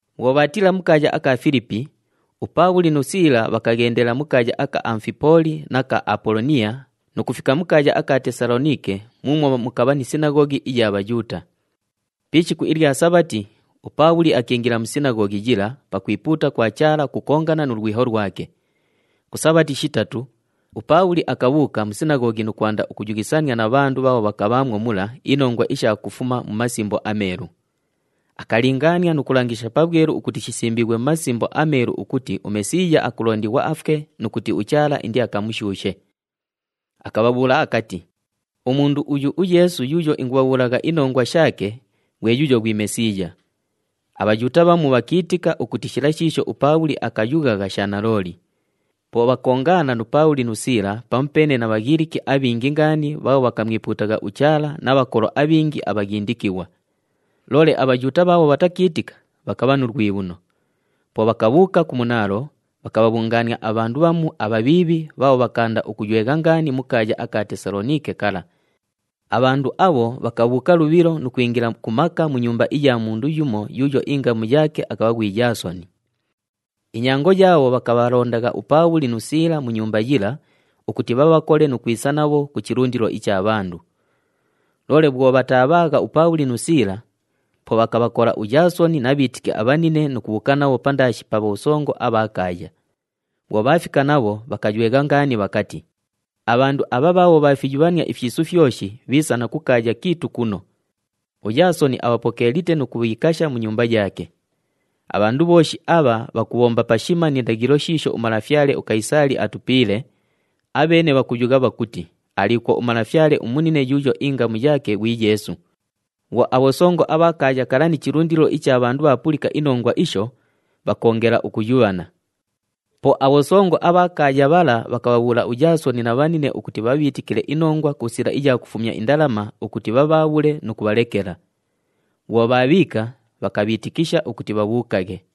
Bhwo bhaatiila mu kaaya aka Filipi, uPaabhuli nu Siila bhakaghendela mu kaaya aka Amufipooli na ka Apoloniya nu kufika mu kaaya aka Tesaloniike muumwo mukabha ni sinaghoghi iya Bhayuuta. Pi ishiku ilya Sabhati, uPaabhuli akiingila mu sinaghoghi yila pakwipuuta kwa Chaala ukukongana nu lwiho lwake. Ku Sabhati shitatu, uPaabhuli akabhuuka mu sinaghoghi nu kwanda ukuyughisania na bhandu bhaabho bhakabhaamwo mula inongwa isha kufuma mu Masimbo aMeelu. Akalingaania nu kulangisha pabhwelu ukuti shisimbiighwe mu Masimbo aMeelu ukuti uMesiiya akulondighwa afwe nu kuti uChaala indiakamushuushe. Akabhabhuula akati, “Umundu uyu uYeesu yuuyo ingubhabhuulagha inongwa shaake, ghwe yuuyo ghwi Mesiiya.” ABhayuuta bhamu bhakiitika ukuti shila shiisho uPaabhuli akayughagha sha nalooli. Po bhakoongaana nu Paabhuli nu Siila pamupeene na Bhaghiliki abhingi ngaani bhaabho bhakamwipuutagha uChaala na bhakolo abhingi abhaghindikighwa. Loole aBhayuuta bhaabho bhatakiitika, bhakabha nu lwibhuno. Po bhakabhuuka ku munaalo, bhakabhabhungaania abhandu bhamu abhabhiibhi bhaabho bhakaanda ukuywegha ngaani mu kaaya aka Tesaloniike kala. Abhandu abho bhakabhuuka lubhilo nu kwingila ku maka mu nyumba iya mundu yumo yuuyo ingamu yaake akabha ghwi Yaasoni. Inyango yaabho bhakabhalondagha uPaabhuli nu Siila mu nyumba yila ukuti bhabhakole nu kwisa nabho ku chilundilo icha bhandu. Loole bhwo bhataabhaagha uPaabhuli nu Siila, po bhakabhakola uYaasoni na bhiitiki abhanine nu kubhuuka nabho pandaashi pa bhosongo abha kaaya. Bhwo bhaafika nabho, bhakaywegha ngaani bhakati, “Abhandu abha bhaabho bhaafiyubhania ifyisu fyoshi bhiisa na ku kaaya kiitu kuno. UYaasoni abhapokeelite nu kubhiikasha mu nyumba yaake. Abhandu bhooshi abha bhakubhomba pashima ni ndaghilo shiisho umalafyale uKayisaali atupiile, abheene bhakuyugha bhakuti aliikwo umalafyale umunine yuuyo ingamu yaake ghwi Yeesu.” Bhwo abhosongo abha kaaya kala ni chilundilo icha bhandu bhaapulika inongwa isho, bhakoongela ukuyubhana. Po abhosongo abha kaaya bhala bhakabhabhuula uYaasoni na bhanine ukuti bhabhiitikile inongwa ku sila iya kufumya indalama ukuti bhabhaabhule nu kubhalekela. Bhwo bhaabhiika, bhakabhiitikisha ukuti bhabhuukaghe.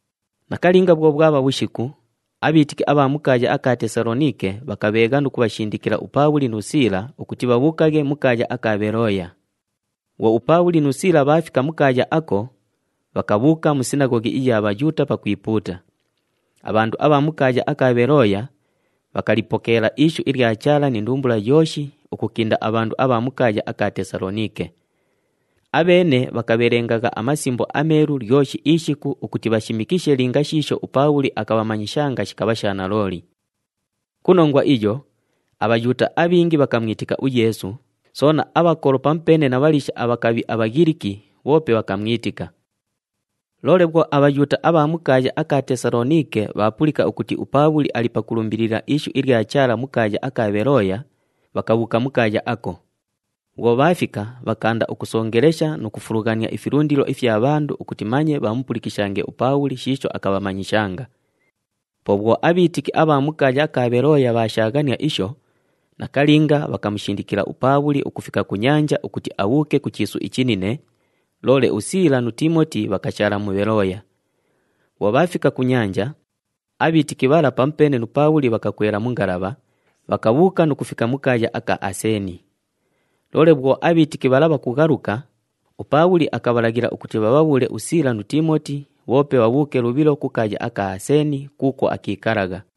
Nakalinga bhwo bhwabha bhushiku, abhiitiki abha mu kaaya aka Tesaloniike bhakabheegha nu kubhashindikila uPaabhuli nu Siila ukuti bhabhuukaghe mu kaaya aka Bhelooya. Bhwo uPaabhuli nu Siila bhaafika mu kaaya ako, bhakabhuuka mu sinaghoghi iya Bhayuuta pakwipuuta. Abhandu abha mu kaaya aka Bhelooya bhakalipokeela ishu ilya Chaala ni ndumbula yooshi ukukinda abhandu abha mu kaaya aka Tesaloniike. Abheene bhakabhelengagha aMasimbo aMeelu lyoshi ishiku ukuti bhashimikishe linga shiisho uPaabhuli akabhamanyishanga shikabha sha nalooli. Ku nongwa iyo, aBhayuuta abhingi bhakamwitika uYeesu, soona abhakolo pamupeene na bhaliisha abhakabhi aBhaghiliki bhoope bhakamwitika. Loole bhwo aBhayuuta abha mu kaaya aka Tesaloniike bhaapulika ukuti uPaabhuli ali pakulumbilila ishu ilya Chaala mu kaaya aka Bhelooya, bhakabhuuka mu kaaya ako. Bhwo bhaafika, bhakaanda ukusongelesha nu kufulughania ifilundilo ifya bhandu ukuti manye bhamupulikishange uPaabhuli shiisho akabhamanyishanga. Po bhwo abhiitiki abha mu kaaya aka Bhelooya bhaashaaghania isho, nakalinga bhakamushindikila uPaabhuli ukufika ku nyanja ukuti abhuuke ku chiisu ichinine, loole uSiila nu Tiimoti bhakashaala mu Bhelooya. Bhwo bhaafika ku nyanja, abhiitiki bhala pamupeene nu Paabhuli bhakakwela mu ngalabha, bhakabhuuka nu kufika mu kaaya aka Aseeni. Loole bhwo abhiitiki bhala bhakughaluka, uPaabhuli akabhalaghila ukuti bhabhabhuule uSiila nu Tiimoti bhoope bhabhuuke lubhilo ku kaaya aka Aseeni kuukwo akiikalagha.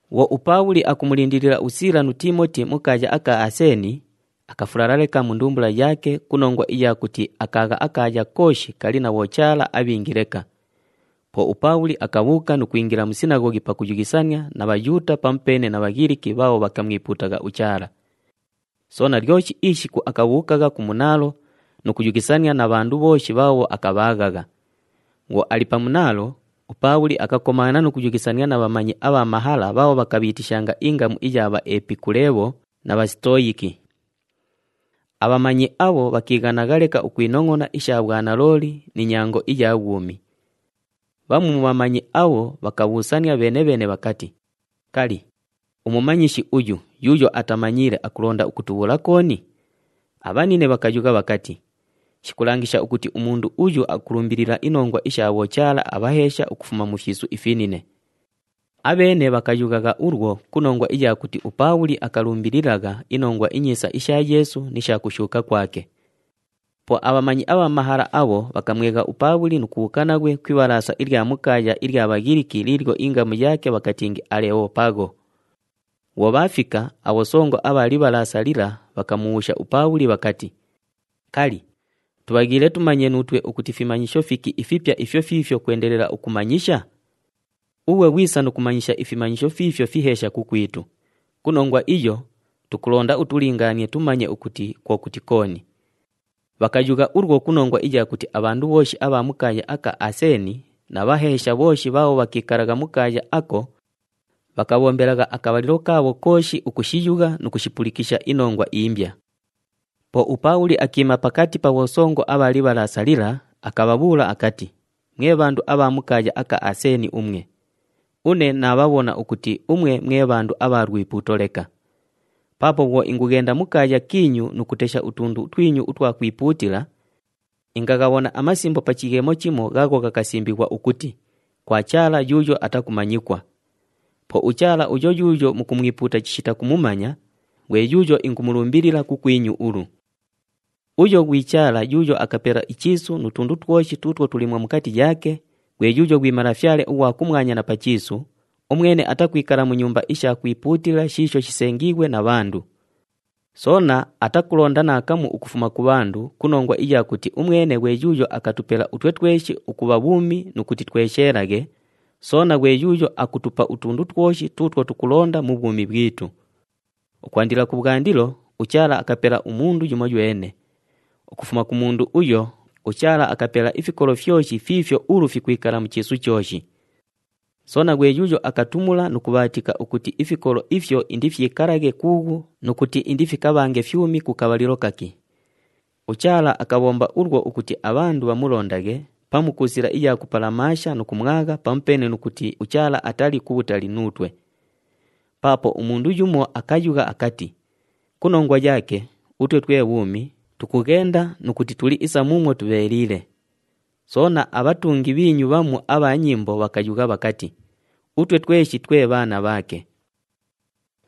Bhwo uPaabhuli akumulindilila uSiila nu Tiimoti mu kaaya aka Aseeni, akafulala leka mu ndumbula yaake ku nongwa iya kuti akaagha akaaya kooshi kali na bhochaala abhingi leka. Po uPaabhuli akabhuuka nu kwingila mu sinaghoghi pakuyughisania na Bhayuuta pamupeene na Bhaghiliki bhaabho bhakamwipuutagha uChaala. Soona, lyoshi ishiku akabhuukagha ku munaalo nu kuyughisania na bhandu bhooshi bhaabho akabhaaghagha. Bhwo ali pa munaalo, uPaabhuli akakomaana nu kuyughisania na bhamanyi abha mahala bhaabho bhakabhiitishanga ingamu iya Bhaepikuleebho na Bhasitoyiki. Abhamanyi abho bhakiighanagha leka ukwinongʼona isha bhwanalooli ni nyango iya bhwumi. Bhamu mu bhamanyi abho bhakabhuusania bheene-bheene bhakati, “Kali, umumanyishi uyu yuuyo atamanyiile akulonda ukutubhuula kooni?” Abhanine bhakayugha bhakati, “Shikulangisha ukuti umundu uyu akulumbilila inongwa isha bhochaala abhaheesha ukufuma mu fyisu ifinine.” Abheene bhakayughagha ulwo ku nongwa iya kuti uPaabhuli akalumbililagha iNongwa iNyiisa isha Yeesu ni sha kushuuka kwake. Po abhamanyi abha mahala abho bhakamwegha uPaabhuli nu kubhuuka naghwe ku ibhalaasa ilya mu kaaya ilya Bhaghiliki liilyo ingamu yaake bhakatingi Alebhopagho. Bhwo bhaafika, abhosongo abha libhalaasa lila bhakamubhuusha uPaabhuli bhakati, “Kali, tubhaghiile tumanye nuutwe ukuti fimanyisho fiki ifipya ifyo fiifyo kwendelela ukumanyisha? Ughwe ghwisa nu kumanyisha ifimanyisho fiifyo fiheesha kukwitu, ku nongwa iyo, tukulonda utulingaanie tumanye ukuti kwo kuti kooni.” Bhakayugha ulwo ku nongwa iya kuti abhandu bhooshi abha mu kaaya aka Aseeni na bhaheesha bhooshi bhaabho bhakiikalagha mu kaaya ako bhakabhombelagha akabhalilo kaabho kooshi ukushiyugha nu kushipulikisha inongwa imbya. Po uPaabhuli akiima pakati pa bhosongo abha libhalaasa lila, akabhabhuula akati, “Mwe bhandu abha mu kaaya aka Aseeni umwe! Une naabhabhona ukuti umwe mwe bhandu abha lwipuuto leka. Paapo bhwo ingughenda mu kaaya kiinyu nu kutesha utundu twinyu utwa kwipuutila, ingaghabhona amasimbo pa chighemo chimo ghaagho ghakasimbighwa ukuti, KWA CHAALA YUUYO ATAKUMANYIKWA. Po uChaala uyo yuuyo mukumwipuuta chishita kumumanya, ghwe yuuyo ingumulumbilila kukwinyu ulu. “Uyo ghwi Chaala yuuyo akapela ichiisu nu tundu twoshi tuutwo tuliimwo mukati yaake, ghwe yuuyo ghwi Malafyale ughwa kumwanya na pa chiisu, umwene atakwikala mu nyumba isha kwipuutila shiisho shisengiighwe na bhandu. Soona atakulonda naakamu ukufuma ku bhandu ku nongwa iya kuti umwene ghwe yuuyo akutupela utwe tweshi ukubha bhuumi nu kuti twesheelaghe, soona ghwe yuuyo akutupa utundu twoshi tuutwo tukulonda mu bhwumi bhwitu. Ukwandila kubhwandilo, uChaala akapela umundu yumoywene. Ukufuma ku mundu uyo, uChaala akapela ifikolo fyoshi fiifyo ulu fikwikala mu chiisu chooshi. Soona ghwe yuuyo akatumula nu kubhaatika ukuti ifikolo ifyo indifikiikalaghe kuughu nu kuti indifikabhange fyumi ku kabhalilo kaki. UChaala akabhomba ulwo ukuti abhandu bhamulondaghe pamu ku sila iya kupalamaasha nu kumwagha pamupeene nu kuti uChaala atali kubhutali nuutwe. Paapo umundu yumo akayugha akati, ‘Ku nongwa yaake, utwe twe bhuumi, tukughenda nu kuti tuli isa muumwo tubheeliile.’ Soona, abhatungi bhiinyu bhamu abha nyimbo bhakayugha bhakati, ‘Utwe tweshi twe bhaana bhaake.’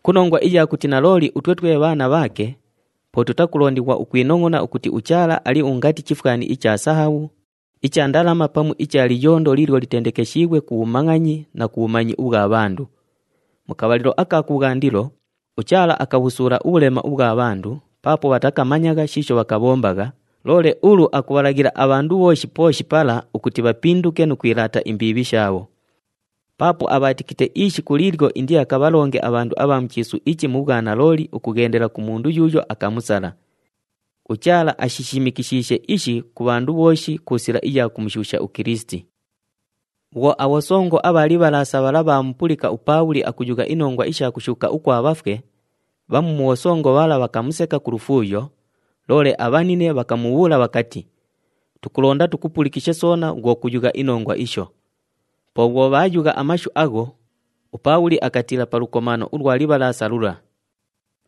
“Ku nongwa iya kuti nalooli utwe twe bhaana bhaake, po tutakulondighwa ukwinongʼona ukuti uChaala ali ungati chifwani icha sahabhu, icha ndalama pamu icha liyondo liilyo litendekeshiighwe ku bhumangʼanyi nu bhumanyi ubhwa bhandu. Mu kabhalilo aka kubhwandilo, uChaala akabhusuula ubhulema ubhwa bhandu paapo bhatakamanyagha shiisho bhakabhombagha, loole ulu akubhalaghila abhandu bhooshi pooshi pala ukuti bhapinduke nu kwilaata imbiibhi shaabho. Paapo abhaatikite ishiku liilyo indiakabhalonge abhandu abha mu chiisu ichi mu bhwanalooli ukughendela ku mundu yuuyo akamusala. UChaala ashishimikishiishe ishi ku bhandu bhooshi ku sila iya kumushuusha uKilisiti.” Bhwo abhosongo abha libhalaasa bhala bhaamupulika uPaabhuli akuyugha inongwa isha kushuuka ukwa bhafwe, bhamu mu bhosongo bhala bhakamuseka ku lufuuyo, loole abhanine bhakamubhuula bhakati, “Tukulonda tukupulikishe soona bhwo kuyugha inongwa isho.” Po bhwo bhaayugha amashu agho, uPaabhuli akatiila pa lukomaano ulwa libhalaasa lula.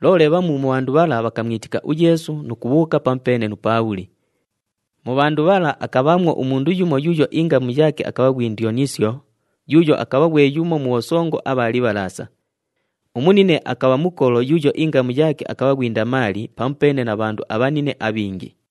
Loole bhamu mu bhandu bhala bhakamwitika uYeesu nu kubhuuka pamupeene nu Paabhuli. Mu bhandu bhala akabhaamwo umundu yumo yuuyo ingamu yaake akabha ghwi Ndyonisyo yuuyo akabha ghwe yumo mu bhosongo abha libhalaasa. Umunine akabha mukolo yuuyo ingamu yaake akabha ghwi Ndamaali pamupeene na bhandu abhanine abhingi.